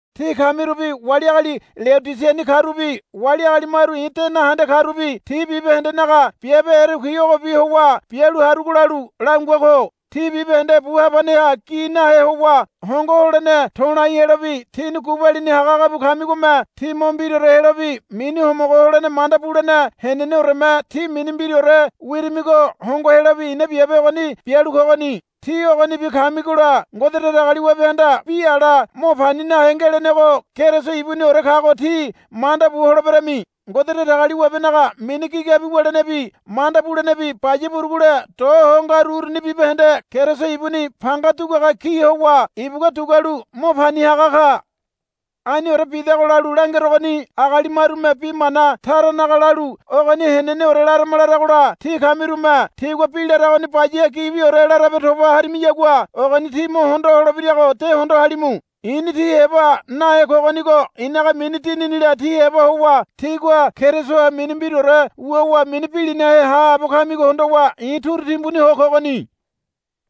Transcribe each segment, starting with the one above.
Tí kamirubi wali agali Leodisiani karubi wali agali maru i̱ de nahende karubi tí bibahendenaga biabe erekui ogobi howa bialu harugo lalu langua ko. Tí bibahende bu habaneha gi nahe howa hongo holene to̱lai helobi tíni gubalini hagahaga bu kamigome tí mo mbiraore helobi mini homogo holene manda bulene heneneoreme tí mini mbiraore wirimigo hongo helobi i̱na biabe ogoni bialu kogoni. Tí ogonibi kamigola Ngode Datagaliwabehanda bi ala mo pani nahe ngelenego Keriso ibuniore kago tí manda bu holeberami. Ngode Datagaliwabenaga mini gigabi wulenebi manda bulenebi baya burugule do ho ngaru uruni bibahende Keriso ibuni panga duguaga ki howa ibugua dugualu mo pani haga ka. Aniore bidago lalu langerogoni agali marume bi mana taranaga lalu ogoni heneneore larama laragola tí kamirume tigua bi laragoni baya gibiore larabe toba harimiyagua ogoni tí mo hondo holebirago de hondo halimu. I̱ni tí heba nahe kogonigo i̱naga mini dininila tí heba howa tígua Kerisoha mini mbiraore wuwa mini bilinahe haabo kamigo hondowa i̱ turu timbuni ho kogoni.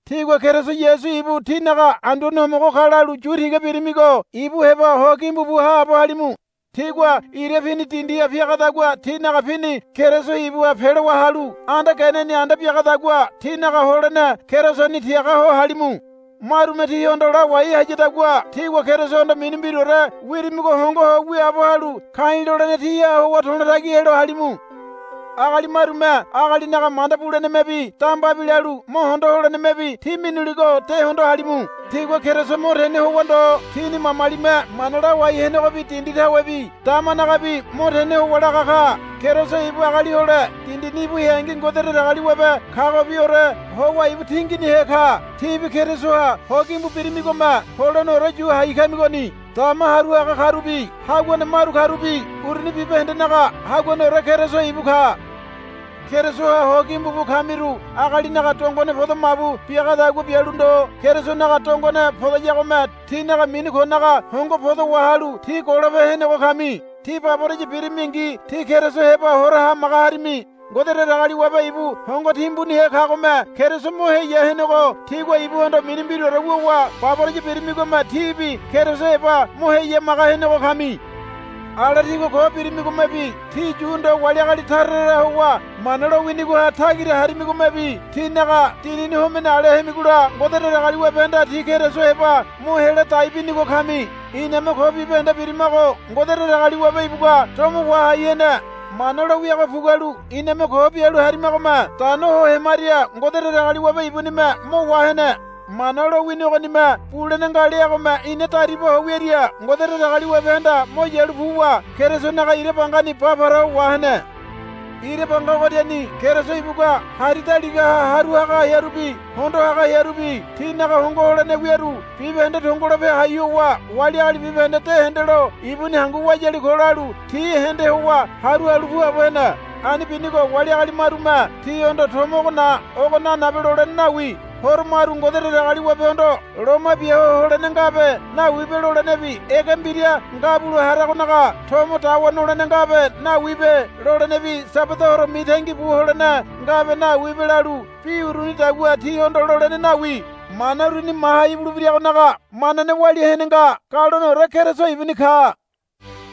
Tígua Keriso Yasu ibu tínaga Anduane Homogo ka lalu yu tiga birimigo ibu heba ho gimbu bu haabo halimu. Tígua ira pini dindiha piagadagua tínaga pini Keriso ibuha pelowa halu anda geneni anda biagadagua tínaga holene Kerisoni tiaga ho halimu. Marume tíhondo lawai hayadagua tígua Kerisohondo mini mbiraore wirimigo hongo ho wiaabo halu ka̱i̱ lolene tíha howa to̱lo tagi helo halimu. Agali marume agalinaga manda bulenemebi dambabi lalu mo hondo holenemebi tí minuligo de hondo halimu. Tigua Keriso mo tene howa ndo tini mamalime mana lawai henegobi dindi tawebi damanagabi mo tene howa laga ka. Keriso ibu agali hole dindini ibu heangi Ngode Datagaliwabe kagobiore howa ibu tinginihe ka. Tíbi Kerisoha ho gimbu birimigome holeneore yu hai kamigoni. Dama haru haga karubi haguane maru karubi uruni bibahendenaga haguaneore Keriso ibu ka. Kerisoha ho gimbu bu kamiru agalinaga dongone podo mabu biagadagua bialu ndo Kerisonaga dongone podayagome tínaga mini konaga hongo podo wahalu tí golope henego kami. Tí baboraya birimingi tí Keriso heba hora hamaga harimi. Ngode Datagaliwabe ibu hongo timbunihe kagome Keriso mo heya henego tígua ibuhondo mini mbiraore wuwa baboraya birimigome tíbi Keriso heba mo heyamaga henego kami. Ala tígua ko birimigomebi tí Yu ndo wali agali tara tara howa Mana lowinigoha tagira harimigomebi tínaga dinini homene ale hemigola Ngode Datagaliwabehanda tí Keriso heba mo hela dai binigo kami. Iname ko bibahende birimago Ngode Datagaliwabe ibugua domo wahai hene. Mana lo wiago pugualu iname ko bialu harimagome dano ho hemaria Ngode Datagaliwabe ibunime mo wahene. Mana lowini ogonime bulene nga leagome ina dariba ho wiaria Ngode Datagaliwabehanda mo yalu puwa Kerisonaga ira bangani ba para ho wahene. Ira banga ogoriani Keriso ibugua hari daligaha haru haga hearubi hondo haga hearubi tinaga hongo holene wiaru bibahende tongolope hai howa wali agali bibahende de hendelo ibuni hangu wayali ko lalu ti hende howa haru halu puabo hene. Ani binigo wali agali marume tíhondo tomo ogo na ogo nanabe lolene nawi. Horo maru Ngode Datagaliwabehondo loma bia ho holene ngabe nawibe lolenebi Ege Mbira Ngabulo haragonaga tomo dawa nolene ngabe nawibe lolenebi Sabada horo mitangi bu holene ngabe nawibe lalu bi urunidagua tíhondo lolene nawi. Mana uruni maha ibulebiragonaga manane walia hene nga. Galoneore Keriso ibuni ka.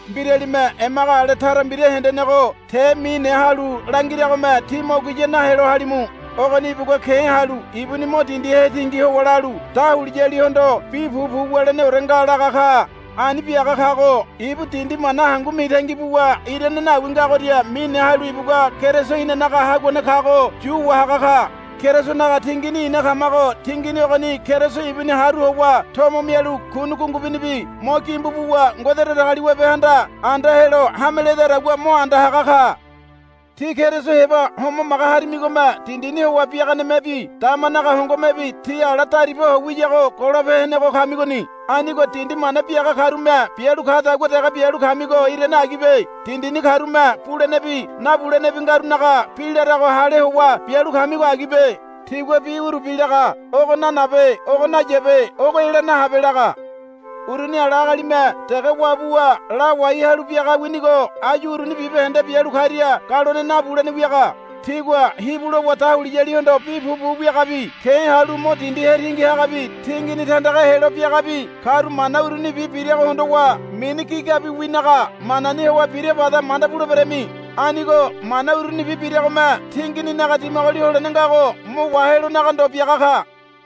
Mbiralime emaga ale tara mbira hendenego te mine halu langiragome tí mo guya nahelo halimu. Ogoni ibugua ke̱ halu ibuni mo dindi hetingi howa lalu, Dahuliyalihondo bi pupu wuleneore nga, laga ka. Ani biaga kago ibu dindi mana hangu mitangi buwa irane nawi ngagoria mine halu ibugua Keriso inanaga haguane kago yu wahaga ka. Kerisonaga tingini ina kamago tingini ogoni Keriso ibuni haru howa tomo mialu kuni gungubunibi mo gimbu buwa Ngode Datagaliwabehanda anda helo hame ledadagua mo anda haga ka. Tí Keriso heba homamaga harimigome dindini howa biaganemebi damanaga hongomebi tí ala dariba ho wiyago golope henego kamigoni. Anigo dindi mana biaga karume bialu kadagua dege bialu kamigo irane agibe. Dindini karume bulenebi nabulenebi ngarunaga bi larago hale howa bialu kamigo agibe. Tigua bi urubi laga, Ogo nanabe. Ogo nayabe. Ogo ela nahabe, laga. Uruni ala agalime dege wabuwa lawai halu biaga winigo áyu uruni bibahende bialu karia galone nabulene wiaga. Tigua hibu lowa dahuliyalihondo bi pupu wiagabi ke̱ halu mo dindi hetingi hagabi tingini tandaga helo biagabi karu mana urunibi birago hondowa mini gigabiwinaga manani howa bira bada manda buleberami. Anigo mana urunibi biragome tingininaga dimagoli holene ngago mo wahelonaga ndo biaga ka.